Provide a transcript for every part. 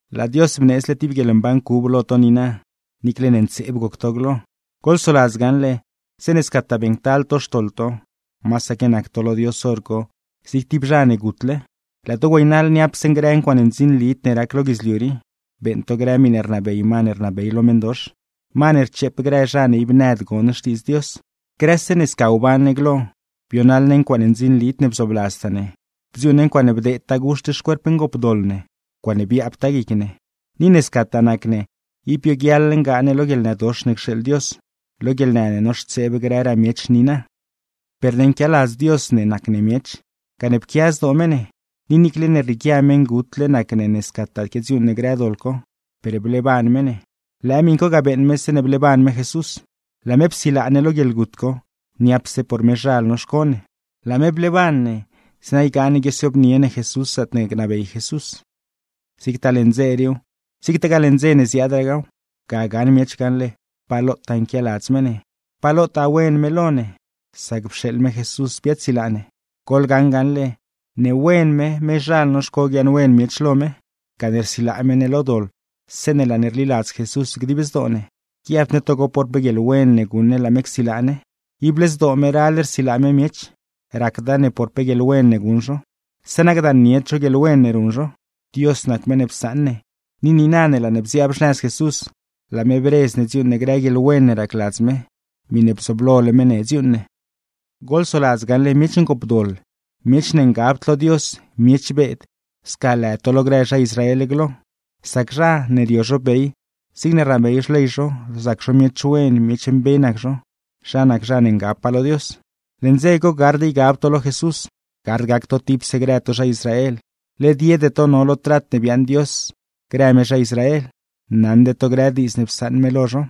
¡Laa Dios bneedzle tib guieḻmban cub lo to niina, niicle ne ntseeb goc to glo! Goḻsoladz gaṉle, zeeṉe scataa beeṉctal to xtoḻ to, masaque nac to lo Dios hor co zig tib zha ne gutle, laa to güeynaḻ niapse grë ncuaaṉe ndzinlid ne rac lo guidzliu rii, beeṉ to grë miṉe rnabey ma ne rnabey lo meṉdox, ma ne rcheep grë zha ne ib nëd gon xtiidz Dios. Grëse ne sca wban ne glo, bionaḻ ne ncuaaṉe ndzinlid ne bzoobladztaa ne, bdziuuṉ ne ncuaaṉe bdeedtaa guxt xcuerp ngoopdoḻ ne, ncuaaṉe biaabtaa guic ne. Ni ne scataa nac ne, ib bioguiaḻ ngaa ne lo guieḻnëdox ne cxeeḻ Dios, lo guieḻnë ne noxtseeb grëraa miech niina. Per ne nquialadz Dios ne nac ne miech, gane pquia zdoo me ne, ni niicle ne rrieequia meṉgutle nac ne ne scataa quiadziuuṉ ne grë doḻ co, per bleeban me ne; lëë miṉ co ga beeṉ me zeeṉe bleeban me Jesús. ¡Laa me psilaa ne lo guieḻgut co, niapse por mezhal noxco ne! Laa me bleeban ne, zeeṉa ygaa ne guiosiobnie ne Jesús zaatne gnabey Jesús. Zigtaa leṉ dze riiw, zigtagaa leṉ dze ne ziaadraaw, ga gaṉ miech gaṉle pa lotaa nquialadz me ne, pa lotaa wen me lo ne, sac pxeeḻ me Jesús biaadsilaa ne. Goḻgaṉ gaṉle, ne wen me mezhal noxco guiaaṉwen miech lo me, gane rsilaa me ne lo doḻ zeeṉe laa ne rliladz Jesús dib zdoo ne; guiabd ne togo por pe guieḻwen ne guṉ ne laa me csilaa ne. Ible zdoo me ral rsilaa me miech, racda ne por pe guieḻwen ne guṉ zho; zeeṉa gdaannied zho guieḻwen ne ruṉ zho. Dios nac meṉ ne psaṉ ne, ni niina ne laa ne bziaab xnëz Jesús, laa me bredz ne dziuuṉ ne grë guieḻwen ne racladz me, miṉe bzooblole me ne dziuuṉ ne. Goḻsoladz gaṉle miech ngoopdoḻ, miech ne ngabd lo Dios, miech beed, sca lë to lo grë zha Israel glo (sac zha, ne rio zho bey zigne rnabey xley zho, rzac zho miech wen, miech mbe nac zho, zha nac zha ne ngabpaa lo Dios). Leṉ dze co gard ygab to lo Jesús, gard gac to tipse grë to zha Israel, led yede to no lo trat ne biaaṉ Dios grë me zha Israel, naṉde to grë diidz ne psaṉ me lo zho.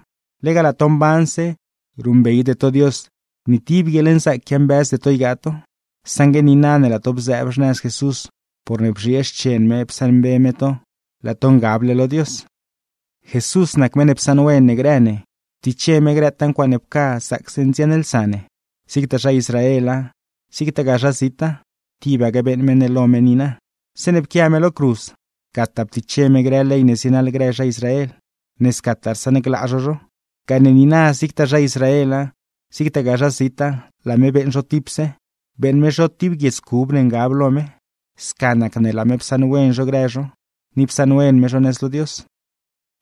Lega laa to mbanse, ruṉbeyde to Dios, ni tib guieḻnzaac quiambëzde to ygaa to. Saṉgue niina ne laa to bzëëb xnëz Jesús porne bzhiee xchen me psaṉmbe me to, laa to ngable lo Dios. Jesús nac meṉ ne psaṉwen ne grë ne, ptiche me grëtaa ncuaaṉe pca zaacse ndziaṉlsa ne; zigtaa zha Israela, zigtagaa zha zita, tibaque beeṉ me ne lo me niina. Zeeṉe pquia me lo cruz, gataa ptiche me grë ley ne zienaḻ zha Israel, ne scataa rsaṉglaa zho zho; gane niina zigtaa zha Israela, zigtagaa zha zita, laa me beeṉ zho tipse, beeṉ me zho tib guiedz cub ne ngab lo me. Sca nac ne laa me psaṉwen zho grë zho, ni psaṉwen me zho nëz lo Dios.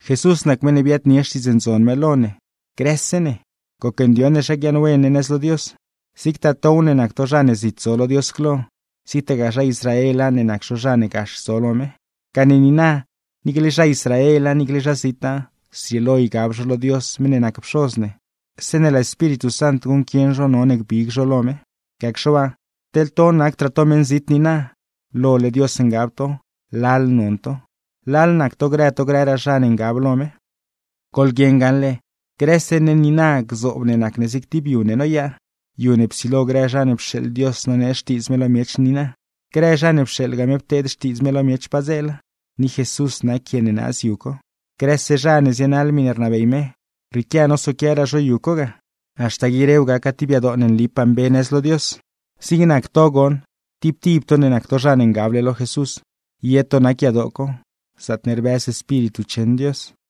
Jesús nac meṉ ne biaadnie Xtiidz Ndzon me lo ne grëse ne, gocndioṉ ne zha guiaaṉwen ne nëz lo Dios, zigtaa tow ne nac to zha ne zit zo lo Dios glo, zigtagaa zha Israela ne nac zho zha ne gax zo lo me. Gane niina, niicle zha Israela, niicle zha zita, zrieelo ygab zho lo Dios meṉ ne nac Pxoz ne, zeeṉe laa Espíritu Sant guṉquieṉ zho none gbig zho lo me. Gacxe waa, teḻ to nacdraa to meṉzit niina, lole Dios ngab to, lal non to, lal nac to grë to grëraa zha ne ngab lo me. Goḻguieṉ gaṉle, grëse ne niina gzoob ne nac ne zig tib yu ne noyaa, yu ne psilo grë zha ne pxeeḻ Dios nonee xtiidz me lo miech niina, grë zha ne pxeeḻgaa me pteed xtiidz me lo miech padzeela, ni Jesús nac quie ne naaz yu co. Grëse zha ne zienaḻ miṉe rnabey me, rrieequia nosoquiaraa zho yu co ga, haxta guirew gaca tib yadoo ne nlipaa mbe nëz lo Dios. Zig nac to goṉ, tib tib to ne nac to zha ne ngab lo Jesús, ye to nac yadoo co, zaatne rbëz Espíritu cheṉ Dios.